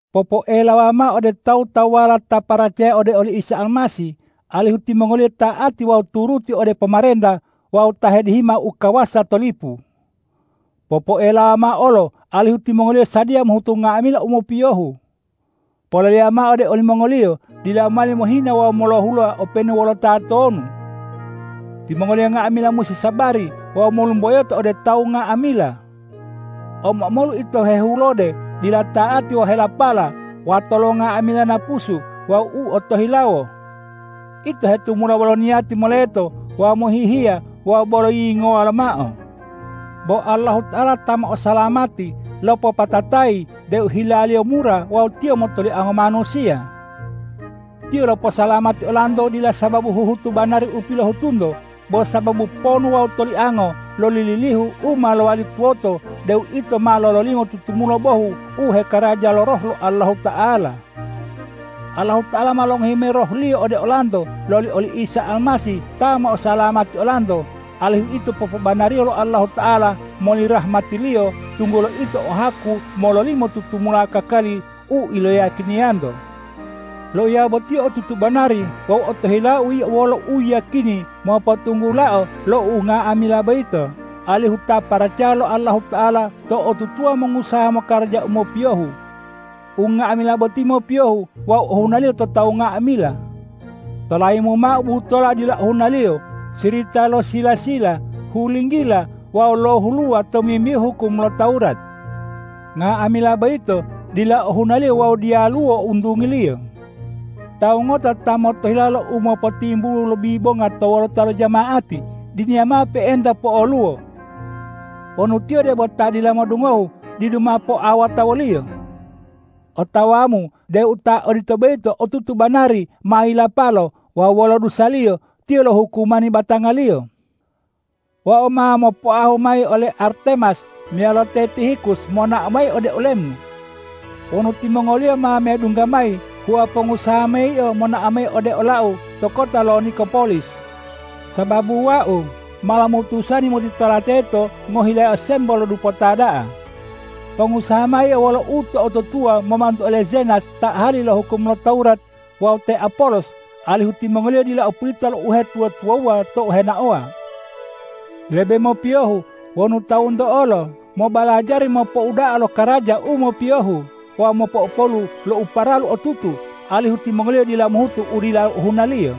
Popoelawa mao ode tawu-tawuwala ta paracaya ode oli Isa Almasih, alihu timongoliyo ta'ati wawu turuti ode pomarenta wawu ta hedihima u kawasa to lipu. Popoelawa mao olo alihu timongoliyo sadiya mohutu nga'amila u mopiyohu. Poleleya mao ode olimongoliyo dila mowali mohina wawu molohuluwa openu wolo tatonu. Timongoliyo nga'amila musi sabari wawu molumboyoto ode tawu nga'amila. Omo-omolu ito hehulode, dila ta'ati wawu helapala, wato lo nga'amila napusu wawu u otohilawo. Ito hetumula wolo niyati moleto wawu mohihiya wawu bolo yiyingowa lomao. Bo Allahuta'ala ta mo'osalamati lopopatatayi deu hila-Liyo mura wawu Tiyo motoliango manusiya. Tiyo loposalamati olanto, dila sababu huhutu banari u pilohutunto, bo sababu ponu wawu toliango loli lilihu u ma lowali tuwoto deu ito ma lololimo tutumula bohu u hekaraja lo Roh lo Allahuta'ala. Allahuta'ala ma longohi mayi Roh-Liyo ode olanto loli oli Isa Almasih ta mo'osalamati olanto, alihu ito popobanariyo lo Allahuta'ala moli rahmati-Liyo, tunggulo ito o haku mololimo tutumula kakali u iloyiyakiniyanto. Loiya boti otutu banari wawu otohilau yio wolo u yiyakini mopotunggulao lo unga'amila boyito, alihu ta paracaya lo Allahuta'ala to'otutuwa mongusaha mokaraja u mopiyohu. Unga'amila boti mopiyohu wawu ohunaliyo to tawu nga'amila. Tolayimu mao butola dila ohunaliyo, sirita lo sila-sila, hulinggila wawu lohuluwa tomimbihu hukum lo Tawurat. Nga'amila boyito dila ohunaliyo wawu diyaluwo untungiliyo. Tawu ngota ta motohilawo lo umopotimbulu lo bibonga to wolota lo jama'ati, diniya mao pe'enta po'oluwo. Wonu tiyo debo ta dila modungohu, didu mao poawota woliyo. Otawamu deu ta odito boyito otutu banari ma yilapalo wawu wolo dusaliyo tiyo lohukumani batangaliyo. Wau ma mopoahu mayi ole Artemas meyalo te Tihikus monao mayi ode olemu. Wonu timongoliyo ma medungga mayi, hua pongusaha mayi yio monao mayi ode olau to kota lo Nikopolis, sababu wau ma lomutusani motitola teto ngohilayao sembo lo dupota da'a. Pongusaha mao yio wolo uto'otutuwa momantu ole Zenas ta ahali lo hukum lo Tawurat wawu te Apolos, alihu timongoliyo dila o pulita lo uhetuwa-tuwawuwa tou henaowa. Lebe mopiyohu wonu tawunto olo mobalajari mopouda'a lo karaja u mopiyohu wawu mopo'opolu lo u paralu otutu, alihu timongoliyo dila mohutu u dila ohunaliyo.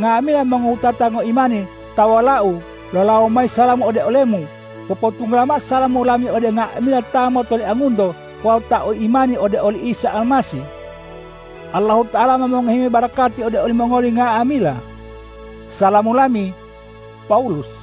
Nga'amila mongowutata ngoimani ta wolau lolawo mayi salamu ode olemu. Popotunggula mao salamu lami ode nga'amila ta motoliangunto wawu ta o imani ode oli Isa Almasih. Allahuta'ala ma mongohi mayi barakati ode olimongoli nga'amila. Salamu lami, Pawulus